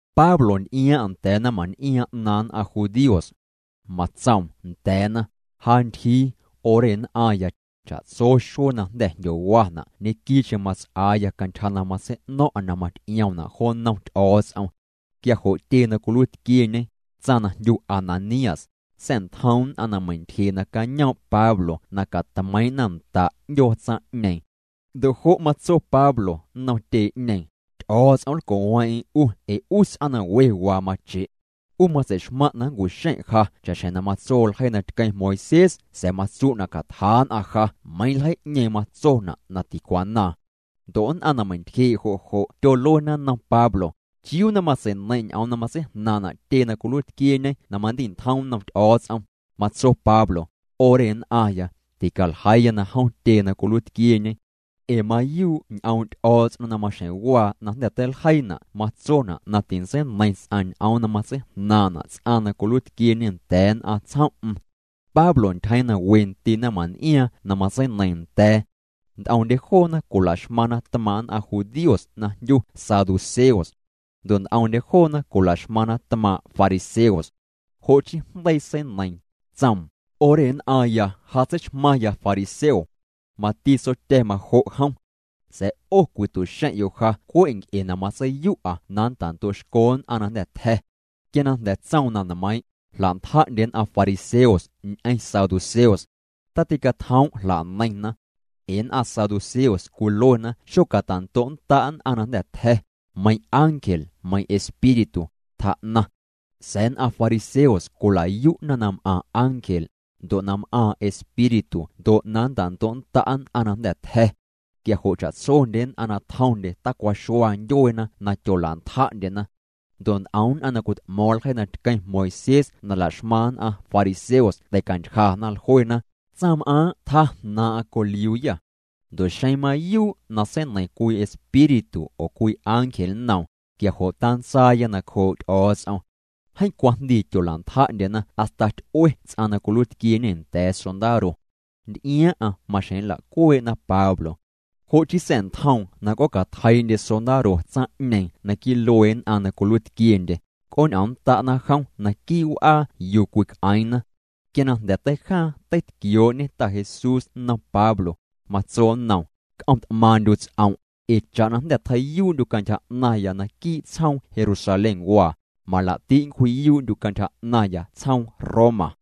Pablo nty'iaaⁿ'aⁿ nda̱a̱ naⁿmaⁿn'iaaⁿ 'naaⁿ nn'aⁿ judíos. Matsoom nda̱a̱na: —Ja ntyjii, 'o re nn'aⁿya, cha'tso xuee na jnda̱ jndyowana' ñequii'cheⁿ mats'aaya cantyja na matsei'no̱ⁿ'a na maty'iomna' jo nnom Ty'o̱o̱ts'om. Quia jo' tyee na cwiluiitquieñe, tsaⁿ na jndyu Ananías, sa̱'ntjoom nn'aⁿ na meintyjee' nacañoom' Pablo na catmeiiⁿ'na nda' 'ndyoo tsaⁿ'ñeeⁿ. Ndo' jo' matso Pablo nnom tyee'ñeeⁿ: —Ty'o̱o̱ts'om nlco'weeⁿ'eⁿ 'u ee 'u ts'aⁿ na we waa mache'. 'U matsei'xmaⁿ' na nncu'xeⁿ' ja cha'xjeⁿ na matso ljeii na tqueⁿ Moisés sa̱a̱ matsu' na catjaa' nn'aⁿ ja meiiⁿ ljeii'ñeeⁿ matsona' na ticwanaaⁿ. Ndo' nn'aⁿ na meintyjee' jo' jo' tyoluena nnom Pablo: —¿Chiuu na matsei'neiⁿ' ñ'oom na matseijnaaⁿ'na' tyee na cwiluiitquieñe na mandi'ntjom nnom Ty'o̱o̱ts'om? Matso Pablo: “'O re nn'aⁿya, ticaljeiiya na jom tyee na cwiluiitquieñe. Ee mayuu' ñ'oom' Ty'o̱o̱ts'om na maxjeⁿ waa na jnda̱ teiljeiina' matsona' na tintseineiⁿ ts'aⁿ ñ'oom na matseijnaaⁿ'na' ts'aⁿ na cwiluiitquieñe nda̱a̱ nn'aⁿ tsjom'm.” Pablo ntyjeeⁿ na we ndii' naⁿmaⁿn'iaaⁿ na matseineiiⁿ nda̱a̱. Nt'omndye joona cwilaxmaⁿna tmaaⁿ' nn'aⁿ judíos na jndyu saduceos. Ndo' nt'omndye joona cwilaxmaⁿna tmaaⁿ' fariseos. Jo' chii jndeii seineiiⁿ, tsoom: —'O re nn'aⁿya ja tseixmaⁿya fariseo. Mati tsotya̱ majo' jom. Sa̱a̱ 'o cwitu'xeⁿ'yo' ja cwe' nc'e na matseiyu'a na nnta'ndo'xco nn'aⁿ na jnda̱ tja̱. Quia na jnda̱ tsoom na nmeiiⁿ', jla'ntja'ndye nn'aⁿ fariseos ñ'eⁿ saduceos. Taticatjoom' jla'neiⁿna. Ee nn'aⁿ saduceos cwiluena xocatando'nnda' nn'aⁿ na jnda̱ tja̱, meiⁿ ángel meiⁿ espíritu, tjaa'naⁿ. Sa̱a̱ nn'aⁿ fariseos cwilayu'na na m'aⁿ ángel, ndo' na m'aaⁿ espíritu ndo' na nntando'nnda' nn'aⁿ na jnda̱ tja̱. Quia jo' cha'tsondye nn'aⁿ na tjomndye tacwaxua ndyueena na tyolantja'ndyena. Ndo' nt'om nn'aⁿ na cwit'mo̱o̱ⁿ ljeii na tqueⁿ Moisés na laxmaⁿ nn'aⁿ fariseos tei'cantyjana, jluena: —Tsaⁿm'aaⁿ' tjaa jnaaⁿ'aⁿ coliuuyâ. Ndo' xeⁿ mayuu' na seineiⁿ cwii espíritu oo cwii ángel nnoom, quia jo' tantsaaya nacjoo' Ty'o̱o̱ts'om. Jeeⁿ cwajndii tyolantja'ndyena hasta ty'ue ts'aⁿ na cwiluiitquieñe nda̱a̱ sondaro. Nty'iaaⁿ'aⁿ maxjeⁿ nla'cuee'na Pablo. Jo' chii sa̱'ntjoom na c'oocatjeii'ndye sondaro tsaⁿ'ñeeⁿ naquii' luee nn'aⁿ na cwiluiitquiendye, c'ooñ'omnnda'na jom naquii' w'aa yuu cwic'eeⁿna. Quia na jnda̱ teijaaⁿ teitquioo'ñe Ta Jesús nnom Pablo, matso nnoom: —C'om't'maaⁿ'ndyu' ts'om', ee cha'na jnda̱ tjei'yuu'ndyu' cantyja 'naⁿya naquii' tsjoom Jerusalénwaa, malaa'ti' nncwji'yuu'ndyu' cantyja 'naⁿya tsjoom Roma.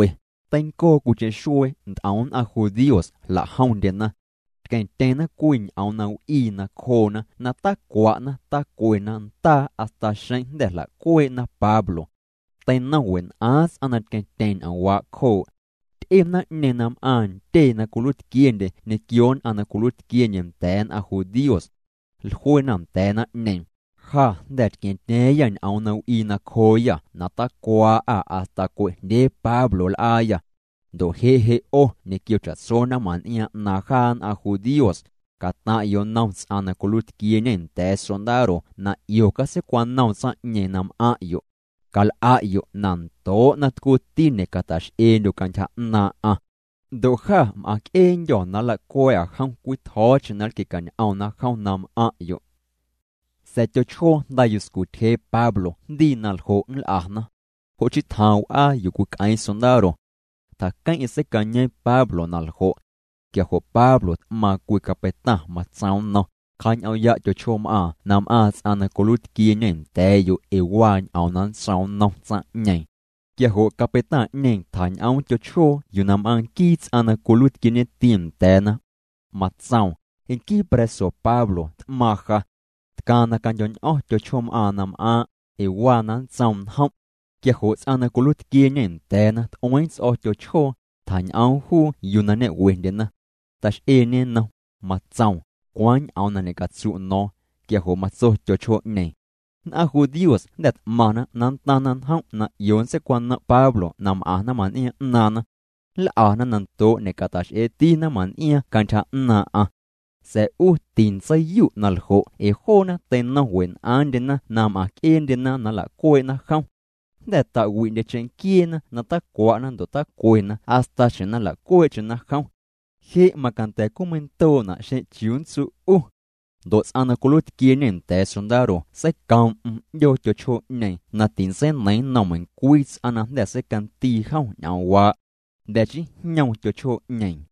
Teincoo cwiicheⁿ xuee nt'om nn'aⁿ judíos jla'jomndyena. Tqueⁿtyeⁿna cwii ñ'oom na w'ii nacjoona na tacwa'na tacwena ndaa hasta xeⁿ jnda̱ jla'cuee'na Pablo. Teinom wen'aaⁿ ts'aⁿ na tqueⁿtyeⁿ ñ'oomwaa' cjoo'. Ty'e naⁿ'ñeeⁿ na m'aⁿ ntyee na cwiluiitquiendye ñequio nn'aⁿ na cwiluiitquiendye nda̱a̱ nn'aⁿ judíos. Jluena nda̱a̱ naⁿ'ñeeⁿ: —Jâ jnda̱ tqua̱ⁿtya̱a̱ⁿyâ ñ'oom na w'ii nacjooyâ na tacwaa'â hasta cue'jndyee Pablo nl'aayâ. Ndo' je' je' 'o ñequio cha'tso naⁿmaⁿn'iaaⁿ 'naaⁿ jaa nn'aⁿ judíos, cataⁿ'yo' nnom ts'aⁿ na cwiluiitquieñe nda̱a̱ sondaro na 'io catseicwanoom tsaⁿ'ñeeⁿ na m'aⁿ'yo'. Cal'a'yo' na ndoo' na tcuuti ñe'cata'x'eendyo' cantyja 'naaⁿ'aⁿ. Ndo' jâ m'aaⁿc'eendyô̱ na nlacua̱a̱'â jom cwii tjo̱o̱cheⁿ na nlquie'ñ'omna jom na m'aⁿ'yo'. Sa̱a̱ tyochjoo jnda yuscu tyjee Pablo jndii na ljo' nl'ana. Jo' chii tjaaⁿ w'aa yuu cwic'eeⁿ sondaro. Tjaqueⁿ'eⁿ seicañeeⁿ Pablo na ljo'. Quia jo' Pablo t'maaⁿ cwii capeitaⁿ. Matsoom nnom: —Cja'ñ'oom'ya' tyochjoom'aaⁿ na m'aaⁿ ts'aⁿ na cwiluiitquieñe nda̱a̱'yo' ee waa ñ'oom na nntsoom nnom tsaⁿ'ñeeⁿ. Quia jo' capeitaⁿ'ñeeⁿ tjañ'oom tyochjoo yuu na m'aaⁿ nquii ts'aⁿ na cwiluiitquieñeti nda̱a̱na. Matsoom: —Nquii pra̱so Pablo t'maaⁿ ja. Tcaaⁿ na candyo̱ñ'o̱ⁿ tyochjoom'aaⁿ na m'aaⁿ', ee waa na nntsoom njom'. Quia jo' ts'aⁿ na cwiluiitquieñe nda̱a̱na t'ueeⁿ ts'o̱ tyochjoo, tjañ'oom juu yuu na ñe'wendyena. Tax'eeñê nnom, matsoom: —¿Cwaaⁿ ñ'oom na ñe'catsu' no̱o̱ⁿ? Quia jo' matso tyochjoo'ñeeⁿ: —Nn'aⁿ judíos jnda̱ t'maⁿna na ntaⁿna njom' na 'io nntseicwanom' Pablo na m'aⁿ naⁿmaⁿn'iaaⁿ 'naaⁿna. Nl'ana na ndoo' ñe'cata'x'eeti naⁿmaⁿn'iaaⁿ cantyja 'naaⁿ'aⁿ. Sa̱a̱ 'u tintseiyu' na ljo' ee joona teinom wen'aaⁿndyena na m'aⁿc'eendyena na nla'cuee'na jom. Jnda̱ ta'wi'ndye cheⁿnquieena na tacwa'na ndo' tacwena hasta xjeⁿ na nla'cuee'cheⁿna jom. Je' macanda̱ cwii meindoo'na xeⁿ chiuu nntsu' 'u. Ndo' ts'aⁿ na cwiluiitquieñe nda̱a̱ sondaro seicoom'm 'ndyoo tyochjoo'ñeeⁿ na tintseineiⁿ nnom meiⁿcwii ts'aⁿ na jnda̱ seicandii jom ñ'oomwaa'. Jnda̱ chii jñoom tyochjoo'ñeeⁿ.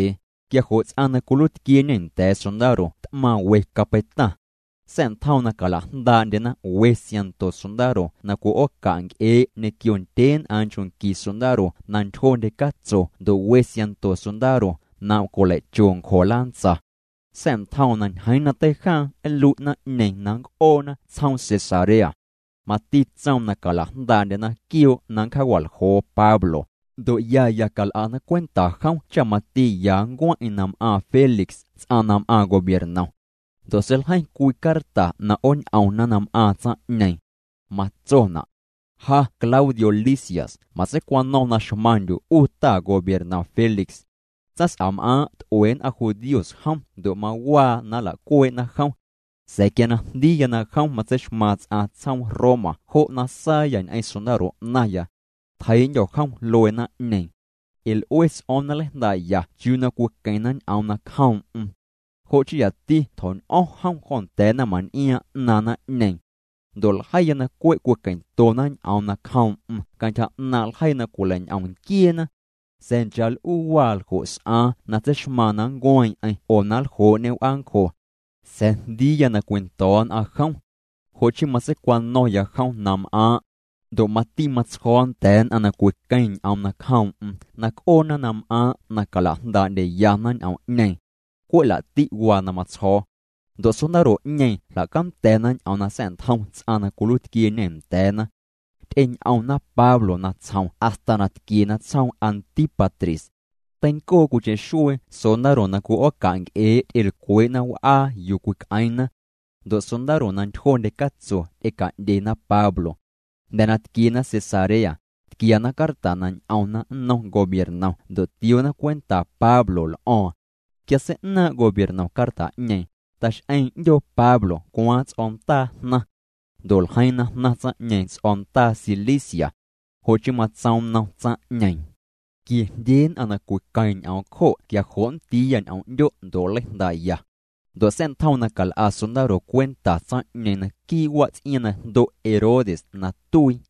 Quia jo' ts'aⁿ na cwiluiitquieñe nda̱a̱ sondaro t'maaⁿ we capeitaⁿ. Sa̱'ntjoom na cala'jndaa'ndyena we siaⁿnto sondaro na cwi'ooca' nc'ee' ñequio ndyeen'aaⁿ nchoo' qui sondaro na ntyjondye catso ndo' we siaⁿnto sondaro na cwileicho ncjo lantsa. Sa̱'ntjoom na ñjeeⁿ na teijaaⁿ nlui' naⁿ'ñeeⁿ na nnc'oona tsjoom Cesarea. Mati tsoom na calajndaa'ndyena quioo' na nncjaawa'ljoo Pablo, ndo' ya ya cal'ana cwenta jom cha mati ya nncueⁿ'eⁿ na m'aaⁿ Félix ts'aⁿ na m'aaⁿ gobiernom. Ndo' seiljeiⁿ cwii carta na 'ooñ'omna na m'aaⁿ tsaⁿ'ñeeⁿ. Matsona': “Ja Claudio Lisias matseicwano̱ⁿ na xmaⁿndyu' 'u ta gobiernom Félix. Tsaⁿs'am'aaⁿ' t'ue nn'aⁿ judíos jom ndo' mawaa na nla'cuee'na jom. Sa̱a̱ quia na jndiiya na jom matseixmaaⁿ ts'aⁿ tsjoom Roma jo' na saayâ ñ'eⁿ sondaro 'naⁿya. Tjeii'ndyo̱ jom luee naⁿ'ñeeⁿ. Ee l'ue ts'o̱o̱ⁿ na nleijndaa'ya chiuu na cwiqueⁿna ñ'oom nacjoom'm. Jo' chii yati tjo̱ñ'o̱ⁿ jom jo nda̱a̱ naⁿmaⁿn'iaaⁿ 'naaⁿ naⁿ'ñeeⁿ. Ndo' ljeiya na cwe' cwiqueⁿtona ñ'oom nacjoom'm cantyja 'naaⁿ' ljeii na cwileiñ'om nquieena. Sa̱a̱ nchaa l'uu waa ljo' s'aaⁿ na tseixmaaⁿ na nncueeⁿ'eⁿ oo na nljoo'ñê w'aancjo. Sa̱a̱ jndiiya na cwindo̱o̱ nn'aⁿ jom. Jo' chii matseicwano̱ⁿya jom na m'aaⁿ'. Ndo' mati matsjo̱o̱ nda̱a̱ nn'aⁿ na cwiqueⁿ ñ'oom nacjoom'm na c'oona na m'aaⁿ' na cala'jndaa'ndyeyana ñ'oom'ñeeⁿ. Cwe' la'ti' waa na matsjo̱o̱.” Ndo' sondaro'ñeeⁿ jla'canda̱na ñ'oom na sa̱'ntjom ts'aⁿ na cwiluiitquieñe nda̱a̱na. Ty'eñ'omna Pablo natsjom hasta na tquiena tsjoom Antípatris. Teincoo cwiicheⁿ xuee sondaro na cwi'ooca' nc'ee' ty'elcwee'na w'aa yuu cwic'eeⁿna. Ndo' sondaro na ntyjondye catso ty'eca'ndyena Pablo. Jnda̱ na tquiena Cesarea, tquiana carta na ñ'omna nnom gobiernom ndo' tioona cwenta Pablo l'o̱o̱ⁿ. Quia sei'naaⁿ' gobiernom carta'ñeeⁿ, ta'x'eeⁿ 'ndyoo Pablo cwaaⁿ ts'o̱ndaa jnaⁿ. Ndo' ljeiiⁿ na jnaⁿ tsaⁿ'ñeeⁿ ts'o̱ndaa Cilicia. Jo' chii matsoom nnom tsaⁿ'ñeeⁿ: —Quiejndyee nn'aⁿ na cwiqueⁿ ñ'oom cjo' quia jo' nndiiya ñ'oom 'ndyo' ndo' nleijndaa'ya. Ndo' sa̱'ntjoom na cal'a sondaro cwenta tsaⁿ'ñeeⁿ naquii' wats'iaaⁿ na jndo' Herodes na tuii.